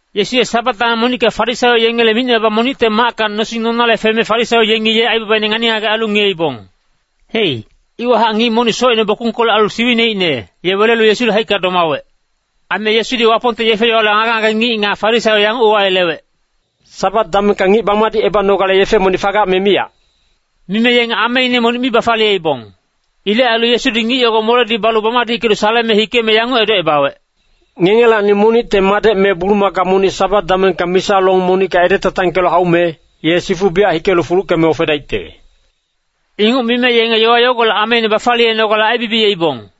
Yesu ye Sabat dameng monicka Farisaio yengele micne monicte macka nosing nonale feme Farisaio yenge ye aibabaine ngani-ngagec ailu ngiyeibong. Hei, iwahac ngic monic socine bokungkolec ailu siwineicne, ye welelu Yesule haicka domawec. Aime Yesudi Wapongte yefe-yowale ngage-ngage ngic nga Farisaio yanguc uwayelewec, “Sabat damengka ngic bamadicebanogale yefe monic fagac me miyac?” Mime yenge ameine monic mi bafaliyeibong. Ilec ailu Yesudi ngic yogo moledi balu bamadickelu saleme hikeme yanguc edocebawec, “Ngengelacni monicte madec me bulumaka monic Sabat damengka misa long monicka edetantangkelu haume, ye sifu biyac hikelu fuluckeme ofedaicte.” Inguc mime yenge yowa yogolec ameine bafaliyenogale aibibiyeibong.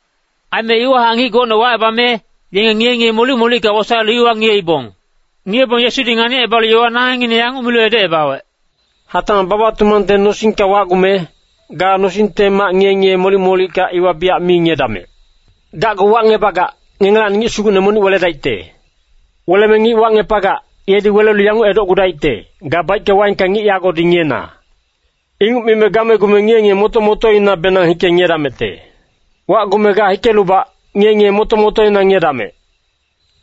Aime iwahac ngic gocne wacebame, yenge ngiye-ngiye molic-molicka wosaelu iwa ngiyeibong. Ngiyebong Yesudi nganicebalu yowa nangengngine yanguc milu edocebawec, “Hatacmac baba-tumangte nosingka wacgume, ga nosingte mac ngiye-ngiye molic-molicka iwa biyac mi ngiyedamec. Gacgu wacngebagac, ngengelacni ngic sugucne monic weledaicte. Weleme ngic wacngepagac, yedi welelu yanguc edocgudaicte, ‘Ga baicke-waengka ngic yagodi ngiyena.’ Inguc mime gamegume ngiye-ngiye moto-motoinabenang hike ngiyedamecte. Wacgume ga hikelubac, ngiye-ngiye moto-motoina ngiyedamec.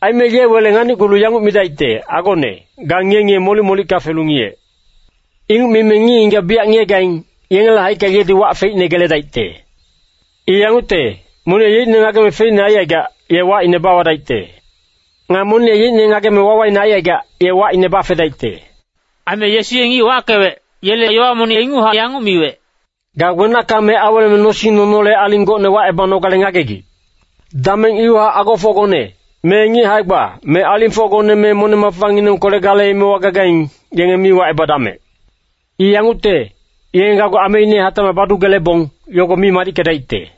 Aime ye wele nganicgulu yanguc midaicte, ‘Agone, ga ngiye-ngiye molic-molicka felu ngiyec!’ Inguc mime ngic-ngigac biyac ngiyegaing, yengele haicka yedi wac feicne geledaicte. I yangucte, monic ye yeicne ngageme feicne aicaigac, ye wacine bawadaicte. Nga monic ye yeicne ngageme wawaine aicaigac, ye wacine bafedaicte.” Aime Yesu ye ngic wackewec, yele yowa monic inguchac yanguc miwec, “Ga wenacka me aweleme nosing nonole aling gocne wacebanogale ngagegic. Dameng iwahac agofocgone, me ngic hae-gba, me alingfocgone me moneng-mafanginengkolec gale emewa gagaing, yenge mi wacebadamec. I yangucte, yenge gacgu ameine hatacmac badugelebong, yogo mi madickedaicte.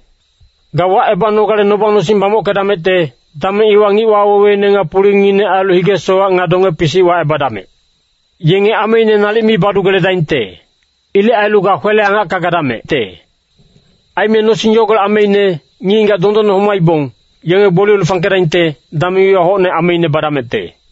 Ga wacebanogale noba-nosing bamockedamecte, dameng iwa ngic waweweine nga pulingngine ailu hige-sowac nga donge-pisic wacebadamec! Yenge ameine nalic mi badugeledaingte. Ilec ailu ga kwele-angacka gadamecte. Aime nosing yogolec ameine, ngic-ngigac dondonne homaibong, yenge gboliyelu fangkedaingte, dameng iwa hocne ameine badamecte.”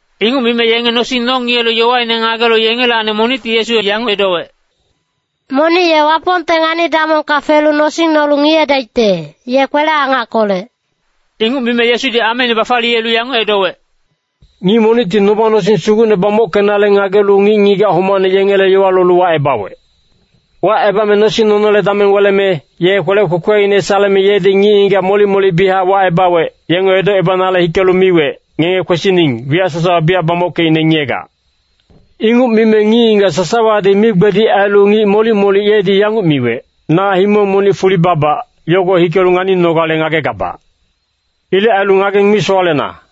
Inguc mime yenge nosing nongiyelu yowaine ngagelu yengelacni monicti Yesu yanguc edowec, “Monic ye Wapongte ngani-damongka felu nosing nolu ngiyedaicte, ye kwele-angackolec.” Inguc mime Yesudi ameine bafaliyelu yanguc edowec, “Ngic monicti noba-nosing sugucne bamockenale ngagelu ngic-ngigac homacne yengele yowa lolu wacebawec. Wacebame nosing nonole dameng weleme, ye kwelec kwekweine saleme yedi ngic-ngigac molic-molic biyachac wacebawec, yenge edocebanale hikelu miwec, ‘Ngenge kwesining, wiyac sasawa biyac bamockeicne ngiyegac.’ “Inguc mime ngic-ngigac sasawadi migbedic ailu ngic molic-molic yedi yanguc miwec, ‘Na himong monic fuli babac, yogo hikelu nganinogale ngagegabac. Ilec ailu ngageng mi sowalena.’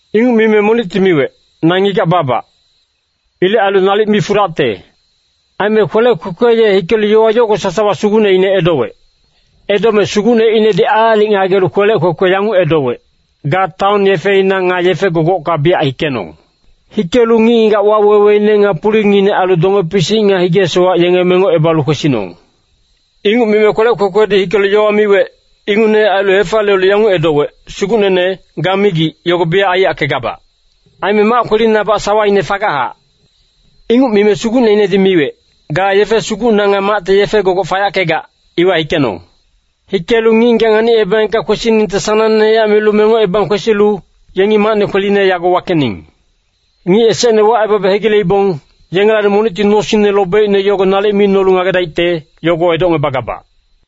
“Inguc mime monicti miwec, ‘Na ngigac babac. Ilec ailu nalic mi fudacte.’ “Aime kwelec kwekwe ye hikelu yowa yogo sasawa sugucneine edowec. Edome sugucneinedi aalic ngagelu kwelec kwekwe yanguc edowec, ‘Ga taon yefeina nga yefe-gogocka biyac hikenong. Hikelu ngic-ngigac waweweine nga pulingngine ailu donge-pisic nga hige-sowac, yenge mengocebalu kwesinong.’ “Inguc mime kwelec kwekwedi hikelu yowa miwec, ingucnehac ailu hefaliyelu yanguc edowec, ‘Sugucnene, ga migic, yogo biyac aiyackegabac. Aime mac kwelinabac sawaine fagachac.’ “Inguc mime sugucneinedi miwec, ‘Ga yefe sugucna nga macte yefe gogoc fayackegac, iwa hikenong. Hikelu ngic-ngigac nganicebaengka kwesiningte sanangnehac milu mengocebang kwesilu, yengi macne kweline yago wakening. Ngic esecne wacebabe hegileibong, yengelacni monicti nosingne lobeicne yogo nalic mi nolu ngagedaicte, yogo edocngebagabac.’”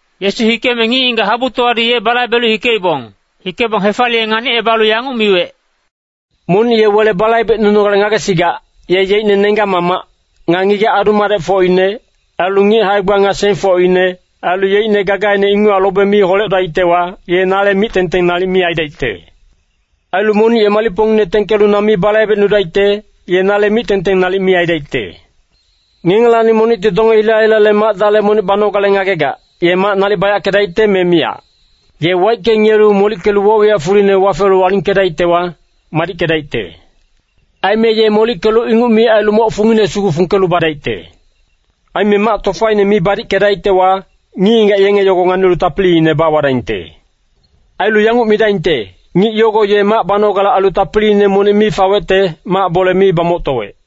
Yesu hikeme ngic-ngigac habutowadi ye balaibelu hikeibong. Hikebong hefaliye nganicebalu yanguc miwec, “Monic ye wele balaibecnunogale ngagesigac, ye yeicne nenggac-mamac, nga ngigac adu-madecfocine, ailu ngic hae-gba nga sengfocine, ailu yeicne gagaine inguchac lobe mi holedaictewa, ye nale mic-tengteng nalic mi aidaicte. Ailu monic ye malicpongine tengkelu na mi balaibecnudaicte, ye nale mic-tengteng nalic mi aidaicte. “Ngengelacni monicti donge hila-hilale mac-dale monic banogale ngagegac, ye mac nalic bayackedaicte me miyac. Ye waicke ngiyelu molickelu woc-wiyac fuline wafelu alingkedaictewa, madickedaicte. Aime ye molickelu inguc mi ailu moc fungine sugu fungkelu badaicte. Aime mac tofaine mi badickedaictewa, ngic-ngigac yenge yogo nganilu tapiliine bawadaingte. Ailu yanguc midaingte, ‘Ngic yogo ye mac banogale ailu tapiliine monic mi fawecte, mac bole mi bamoctowec.’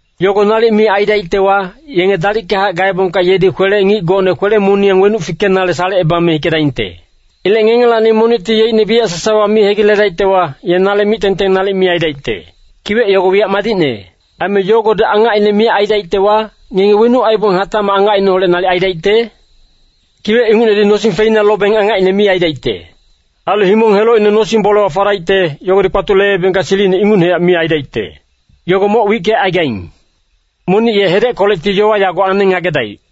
Yogo nalic mi aidaictewa, yenge dalickahac gaebongka yedi kwelec ngic gocne kwele-moniyang wenuc fikenale salecebame hikedaingte. Ilec ngengelacni monicti yeicne wiyac sasawa mi hegiledaictewa, ye nale mic-tengteng nalic mi aidaicte. “Kiwec yogo wiyac madicne. Aime yogodi angacine miyac aidaictewa, ngenge wenuc aibong hatacmac angacineholec nalic aidaicte? Kiwec ingucnedi nosing feina lobeng angacine mi aidaicte. Ailu himong helocine nosing-bolewa fadaicte, yogodi kpatuleebengka silicine ingucnehac mi aidaicte. Yogo moc wickecaigaing. Monic ye hedeckolecti yowa yago aneng ngagedaic.”